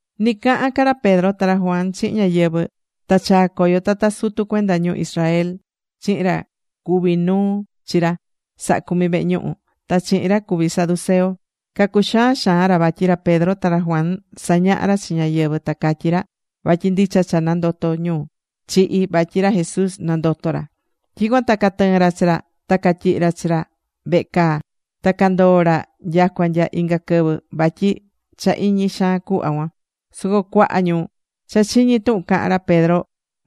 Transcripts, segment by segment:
Ni cahán ca ra Pedro ta ra Juan chihin ñáyɨvɨ, ta chaa̱ coyo tata sutu cuenda ñu Israel chihin ra cuví nuu chi ra sahá cumi vehe ñuhu, ta chihin ra cuví saduceo. Cacuxaan xaan ra vatyi ra Pedro ta ra Juan sañahá ra chi ñáyɨvɨ ta catyí ra vatyi ndicha cha nandotó ñu chihi̱, vatyi ra Jesús nandoto̱ ra. Tyicuan ta catɨɨ̱n ra chi ra. Ta catyihi̱ ra chi ra vehe caa. Ta candoo̱ ra nyacua nya inga quɨvɨ vatyi cha iñi xaan cuhva cuan. Soco cuaha ñu cha chiñi̱ tuhun cahán ra Pedro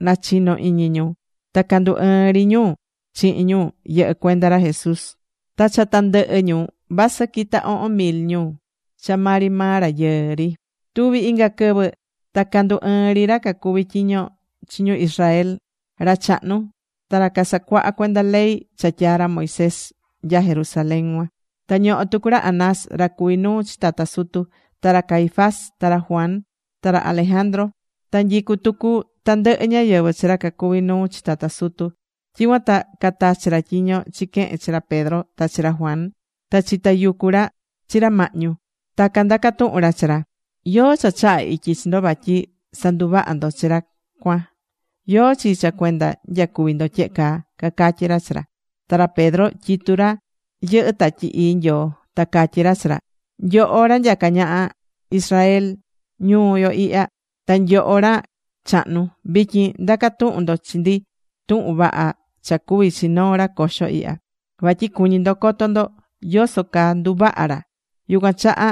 nachinó iñi ñu. Ta candu ɨɨn ri ñu chihin ñu yɨhɨ́ cuenda ra Jesús. Ta cha tandɨhɨ ñu vasɨ quita ohon mil ñu cha maa ri maa rayɨɨ ri. Tuvi inga quɨvɨ ta candu ɨɨn ri ra cacuví tyiño chi ñu Israel, ra chahnu, ta ra casacuaha cuenda ley cha tyaa̱ ra Moisés, nya Jerusalén cuan. Ta ñohó tucu ra Anás ra cuví nuu chi tata sutu. Ta ra Caifás, ta ra Juan, ta ra Alejandro. Ta nyicú tucu tandɨhɨ ñáyɨvɨ chi ra cacuví nuu chi tata sutu. Tyicuan ta catachi̱ ra tyiño chiquehe̱n chi ra Pedro ta chi ra Juan. Ta chitayucu̱ ra chi ra mahñu. Ta candaca̱ tuhun ra chi ra: ―¿Yóó cha chaha̱ ityi chi ndo vatyi sanduvaha̱ ndo chi ra cuan? ¿Yóó chi cha cuenda nyacuvi̱ ndo tyehe caa? ―cacatyí ra chi ra. Ta ra Pedro tyitu ra yɨhɨ́ Tatyi Ii Nyoo. Ta catyí ra chi ra: ―Nyoho ra nyacá ñaha Israel ñuu yo ihya. Ta nyoho ra chahnu. Vityin ndacá tuhun ndo chi ndi tuhun vaha cha cuvi̱ chi noo ra coxo ihya, vatyi cuñí ndo coto ndo yoso caa nduvaha̱ ra. Yucuan chaha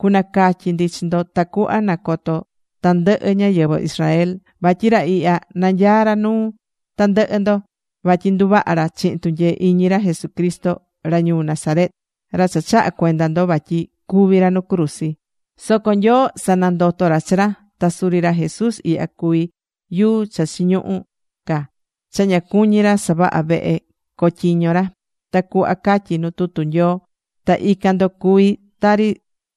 cunacatyi ndi chi ndo tacuhva nacoto tandɨhɨ ñáyɨvɨ Israel. Vatyi ra ihya nanyaá ra nuu tandɨhɨ ndo. Vatyi nduvaha̱ ra chihin tunyee iñi ra Jesucristo ra ñuu Nazaret, ra cha chaha̱ cuenda ndo vatyi cúvi ra nu cruzi. Soco Nyoo sanandoto̱ ra chi ra. Ta suri ra Jesús ihya cuví yuu cha chiñuhú ca cha ña cuñí ra savahá vehe cotyiño ra, tari cuhva catyí nuu tutu Nyoo. Ta ican ndo cuví tari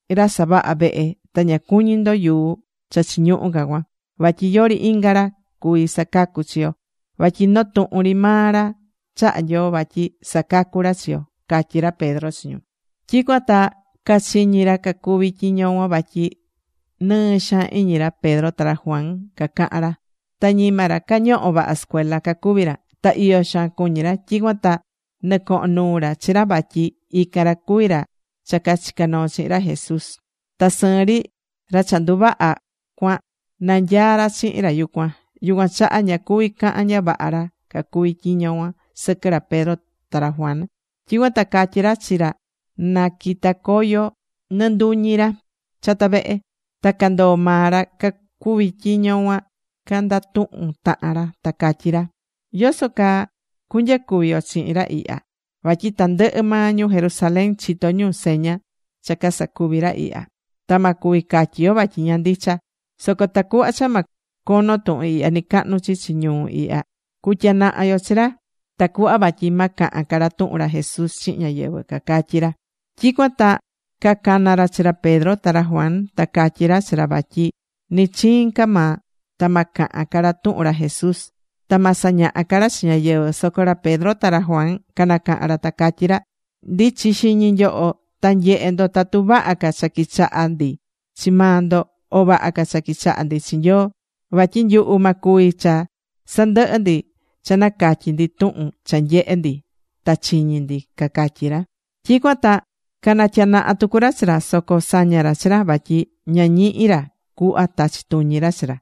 ra savahá vehe ta ña cuñí ndo yuu cha chiñuhu ca cuan. Vatyi yori inga ra cuví sacacú chi yo. Vatyi noo tuhun ri maa ra chaha̱ Nyoo vatyi sacacu ra chi yo. ―catyí ra Pedro chi ñu. Tyicuan ta cachiñi̱ ra cacuvi tyiño cuan vatyi nɨɨ xaan iñi ra Pedro ta ra Juan cacahán ra. Ta ñima ra cañoho̱ vaha sɨcuela cacuví ra. Ta iyo xaan cuñi̱ ra. Tyicuan ta nɨcoho̱n nuu ra chi ra vatyi ican ra cuví ra cha cachica̱ noo chihin ra Jesús. Ta sɨɨn ri, ra cha nduvaha̱ cuan, nanyaá ra chihin ra yucuan. Yucuan chaha ña cuví cahan ña vaha ra cacuvi tyiño cuan sɨquɨ ra Pedro ta ra Juan. Tyicuan ta catyi̱ ra chi ra naquita coyo nɨnduñi ra chata vehe. Ta candoo̱ maa ra cacuví tyiño cuan candatuhun tahan ra. Ta catyí ra: ―¿Yoso caa cunyacuvi yo chihin ra ihya? Vatyi tandɨhɨ maa ñu Jerusalén chitó ñu seña cha casacuvi̱ ra ihya. Ta ma cuvi catyi yo vatyi ña ndicha. Soco tacuhva cha ma cono tuhun ihya nɨcahnu chichi ñuu ihya, cutyanaha yo chi ra, tacuhva vatyi ma cahan ca ra tuhun ra Jesús chihin ñáyɨvɨ ―cacatyí ra. Tyicuan ta cacana̱ ra chi ra Pedro ta ra Juan. Ta catyi̱ ra chi ra vatyi ni chiin ca maa ta ma cahan ca ra tuhun ra Jesús. Ta ma sañaha ca ra chi ñáyɨvɨ. Soco ra Pedro ta ra Juan canacaha̱n ra ta catyí ra: ―Ndi̱chi xiñi nyoho ta nye̱he ndo tatu vaha ca cha quichaha ndi chi maa ndo o vaha ca cha quichaha ndi chi Nyoo. Vatyi nyuhu ma cuvi cha sandɨhɨ ndi cha nacatyi ndi tuhun cha nyehe̱ ndi ta chiñi̱ ndi ―cacatyí ra. Tyicuan ta nacatyanaha̱ tucu ra chi ra. Soco saña̱ ra chi ra vatyi ña ñihi̱ ra cuhva tachi tuñi ra chi ra.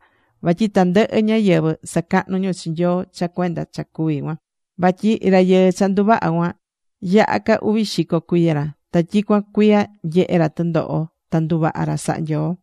Vatyi tandɨhɨ ñáyɨvɨ sacahnú ñu chi Nyoo cha cuenda cha cuvi̱ cuan. Vatyi rayɨɨ cha nduvaha̱ cuan, yaha ca uvi xico cuiya ra, ta tyicuan cuiya nyehe̱ ra tɨndoho ta nduvaha̱ ra saha Nyoo.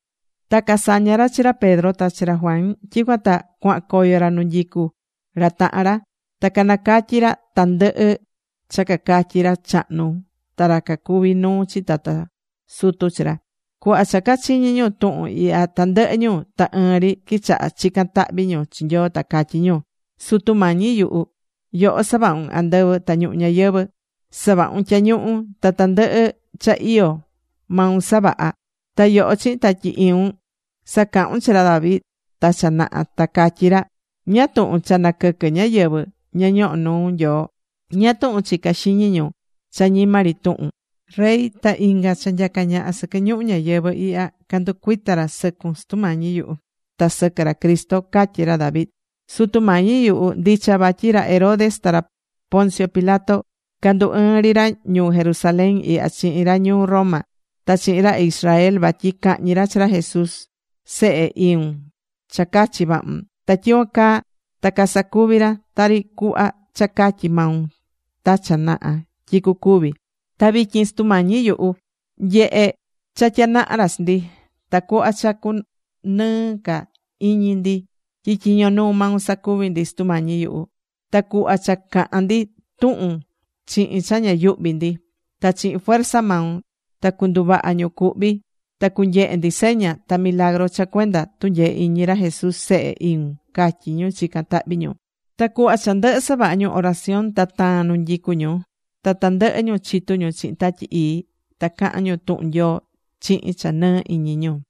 Ta casaña̱ ra chi ra Pedro ta chi ra Juan. Tyicuan ta cuahan coyo ra nu nyicú ra tahan ra. Ta canacatyí ra tandɨhɨ cha cacatyi̱ ra chahnu ta ra cacuví nuu chi tata sutu chi ra. Cuhva cha cachiñi̱ ñu tuhun ihya tandɨhɨ ñu ta ɨɨn ri quichaha̱ chican tahvi ñu chi Nyoo. Ta catyí ñu: ―Sutu Mañi yuhu, yoho savahu̱n andɨvɨ ta ñuhu ñayɨvɨ̱. Savahu̱n tyañuhu. Ta tandɨhɨ ca cha iyó, maun savaha̱. Ta yoho chihin Tatyi Iun sacahu̱n chi ra David ta cha naha. Ta catyí ra: ¿Ñáá tuhun cha naquɨquɨ ñáyɨvɨ ña ñohó nuu Nyoo? ¿Ñáá tuhun chicá xiñi ñu cha ñima ri tuhun? Rey ta inga cha nyacá ñaha sɨquɨ ñuhu ñayɨvɨ̱ ihya candu cuita ra sɨcun Sutu Mañi yuhu, ta sɨquɨ ra Cristo, catyi ra David. Sutu Mañi yuhu, ndicha vatyi ra Herodes, ta ra Poncio Pilato candu ɨɨn ri ra ñuu Jerusalén ihya chihin ra ñuu Roma ta chihin ra Israel vatyi cahñi ra chi ra Jesús Sehe iun cha cachi̱ vahun. Ta tyicuan caa ta casacuvi̱ ra, tari cuhva cha catyi̱ maun ta cha naha tyi cucuvi. Ta vityin, Sutu Mañi yuhu, nye̱he cha tyanaha̱ ra chi ndi. Ta cu̱hva cha cunɨɨ ca iñi ndi tyi tyiño nuu maun sacuvi ndi, Sutu Mañi yuhu. Ta cu̱hva cha cahan ndi tuhun chihin cha ña yuhví ndi. Ta chihin fuerza maun ta cunduvaha ñu cuhví, ta cunyehe ndi seña ta milagru cha cuenda tunyee iñi ra Jesús Sehe iun ―catyí ñu chicán tahvi ñu. Ta cuhva cha ndɨhɨ savaha ñu oración ta taa̱n nu nyicu ñu. Ta tandɨhɨ ñu chitu ñu chihin Tatyi Ii ta caha̱n ñu tuhun Nyoo chihin cha nɨɨ iñi ñu.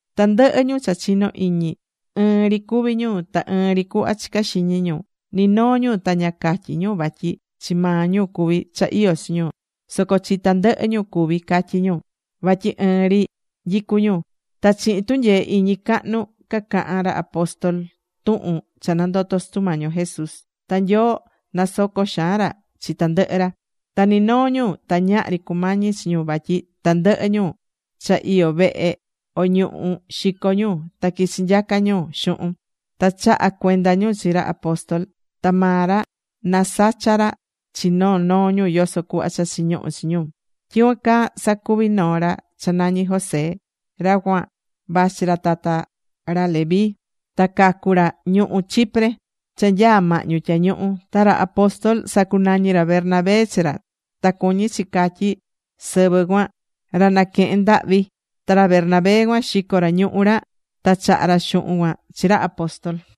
Tandɨhɨ ñu cha chinó iñi, ɨɨn ri cuví ñu, ta ɨɨn ri cuhva chicá xiñi ñu. Ni noo ñu ta ña catyí ñu vatyi chi maa ñu cuví cha iyó chi ñu, soco chi tandɨhɨ ñu cuví, catyí ñu. Vatyi ɨɨn ri nyicú ñu. Ta chihin tunyee iñi cahnu, cacahán ra apóstol tuhun cha nandoto̱ Sutu Mañi yo Jesús. Ta Nyoo nasocó xaan ra chi tandɨhɨ ra. Ta ni noo ñu ta ñahri cumañí chi ñu vatyi tandɨhɨ ñu cha iyó vehe o ñuhú, xicó ñu. Ta quichi nyacá ñu xuhun, ta chahá cuenda ñu chi ra apóstol. Ta maa ra nasachá ra chi noo noo ñu yoso cuhva cha chiñuhú chi ñu. Tyicuan caa sacuvi̱ noo ra cha nañi José. Ra cuan vachi ra tata ra Levi. Ta cacu̱ ra ñuhú Chipre cha nyaá mahñu tyañuhu. Ta ra apóstol sacunañi̱ ra Bernabé chi ra. Ta cuñí chi catyí sɨvɨ cuan: Ra Naquehen Ndahvi. Ta ra Bernabé cuan xico̱ ra ñuhú ra. Ta chaha̱ ra xuhun cuan chi ra apóstol.